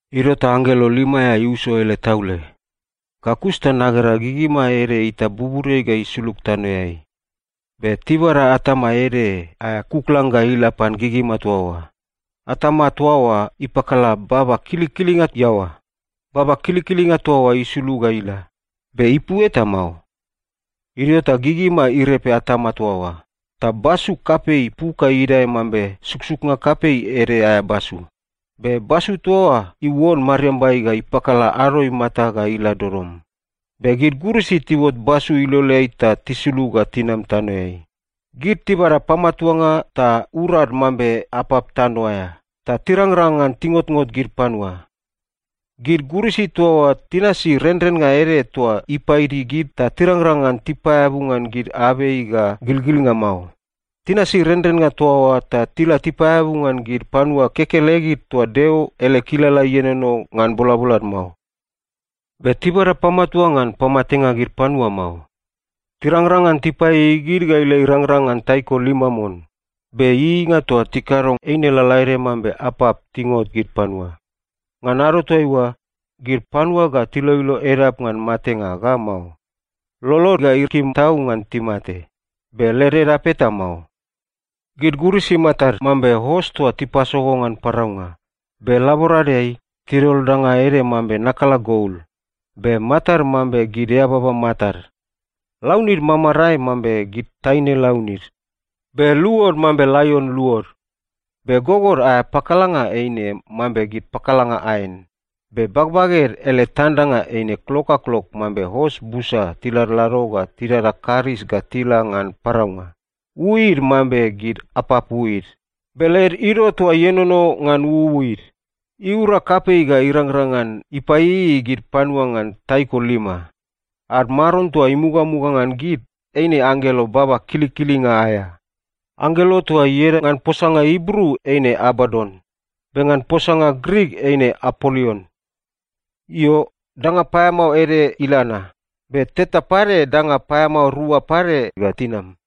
Idio ta anggelo lima aea iuso ele taule. Ga kus ta nagera gigima ede itap buburiai ga isulug tanoeai. Be tibada atama ede aea kuklang ga ila pan gigima toa oa. Atama toa oa ipakala baba kilikilinga iaoa. Baba kilikilinga toa oa isulug ga ila, be ipu eta mao. Idio ta gigima irepe atama toa oa, ta basu kapei puk ga idae mambe suksuknga kapei ede aea basu. Be basu toa oa iuon mariambai ta ipakala ado imata ga ila dodom. Be gid gurisi tiuot basu iloleai ta tisulug ga tinam tanoeai. Gid tibada pamatuanga ta urad mambe apap tano aea, ta tirangrang ngan tingotngot gid panua. Gid gurisi toa oa tinasi renrennga ede toa ipaidi gid ta tirangrang ngan tipaeabu ngan gid abei ga gilgilnga mao. Tinasi renrennga toa oa ta tila tipaeabu ngan gid panua kekelegid toa Deo ele kilala ienono ngan bolabolad mao. Be tibada pamatuanga ngan pamatenga gid panua mao. Tirangrang ngan tipaieiei gid ga ila irangrang ngan taiko lima mon. Be ieieinga toa tikado, eine lalaede mambe apap tingot gid panua. Ngan ado toaiua, gid panua ga tiloilo edap ngan matenga ga mao. Lolod ga ikim tau ngan timate, be led edap eta mao. Gid gurisi matad mambe os toa tipasogo ngan paraunga. Be laboradeai, tidol danga ede mambe nakala gol. Be matad mambe gid eababa matad. Launid mamarae mambe gid taine launid, be luod mambe laion luod. Be gogod aea pakalanga eine mambe gid pakalanga aen, be bagbaged ele tandanga eine klok ga klok mambe os busa tiladlado ga tidada karis ga tila ngan paraunga. Uuid mambe gid apap uuid, be led ido toa ienono ngan uuid, iura kapei ta irangrang ngan ipaieiei gid panua ngan taiko lima. Ad maron toa imugamuga ngan gid, eine anggelo baba kilikilinga aea. Anggelo toa oa ieda ngan posanga Ibru eine Abadon. Be ngan posanga Grik ieda Apolion. Io, danga paeamao ede ila na. Be teta pade danga paeamao rua pade ga tinam.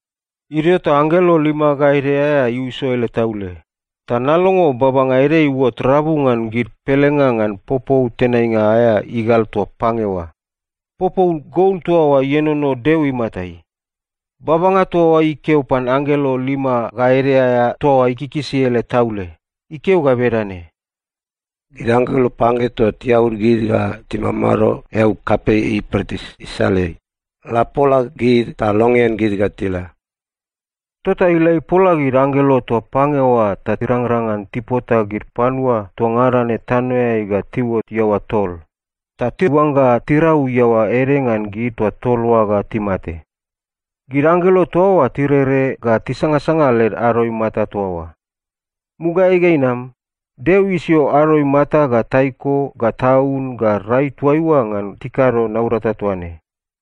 Idio ta anggelo lima ga ede aea iuso ele taule, ta nalongo babanga ede iuot rabu ngan gid pelenga ngan popou tenainga aea igal toa pange oa. Popou gol toa oa ienono Deo imatai. Babanga toa oa ikeo pan anggelo lima ga ede aea toa ikikisi ele taule. Ikeo ga bedane, “Gid anggelo pange toa tiaud gid ga timamado eau kapei Iupretis isaleai, la pola gid ta longean gid ga tila.” Tota ila ipola gid anggelo toa pange oa ta irangrang ngan tipota gid panua toa ngada ne tanoeai ga tiuot iaoa tol, ta tiuangga tirau iaoa ede ngan gid toa tol oa ga timate. Gid anggelo toa oa tirere ga tisangasanga led ado imata toa oa. Mugaeai ga inam, Deo isio ado imata ga taiko ga taun ga rai toaiua ngan tikado naurata toa ne.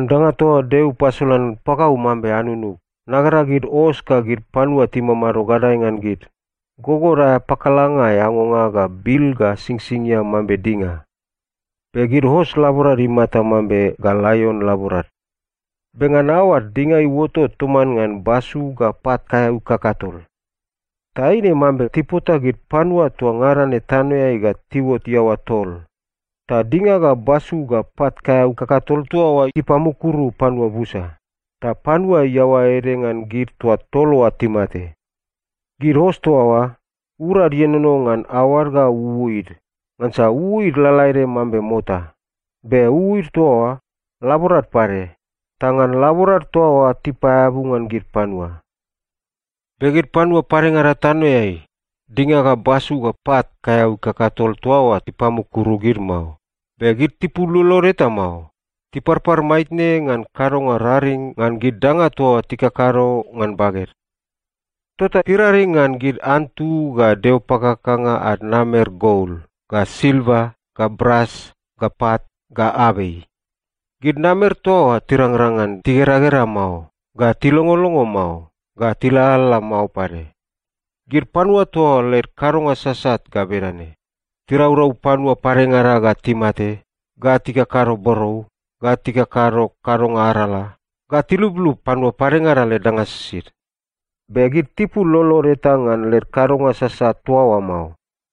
Ngan danga toa Deo ipasolan pagau mambe anunug, nagera gid os ga gid panua timamado gadae ngan gid, gogod aea pakalanga eangonga ga bil ga singsingia mambe dinga. Be gid os laborad imata mambe ga laion laborad. Be ngan aoad, dinga iuotot toman ngan basu ga pat kaeau kakatol. Ta eine mambe tipota gid panua toa ngada ne tanoeai ga tiuot iaoa tol. Ta dinga ga basu ga pat kaeau kakatol toa oa ipamukuru panua busa, ta panua iaoa ede ngan gid toa tol oa timate. Gid os toa oa, urad ienono ngan aoad ga uuid. Ngansa uuid lalaede mambe mota. Be uuid toa oa, laborad pade, ta ngan laborad toa oa tipapaeabu ngan gid panua. Be gid panua padengada tanoeai, dinga ga basu ga pat kaeau kakatol toa oa ipamukuru gid mao. Be gid tipul lolod eta mao. Tiparpar maitne ngan kadonga raring ngan gid danga toa tikakado ngan baged. Tota tiraring ngan gid antu ga deo pakakanga ad namer gol, ga silva, ga bras, ga pat, ga abei. Gid namer toa oa tirangrang ngan tigeragera mao, ga tilongolongo mao, ga tilalala mao pade. Gid panua toa oa led kadonga sasat ga bedane: Tiraurau panua padengada ga timate, ga tikakado borou, ga tikakado kadonga arala, ga tilublub panua padengada led danga sisid. Be gid tipul lolod eta ngan led kadonga sasat toa oa mao.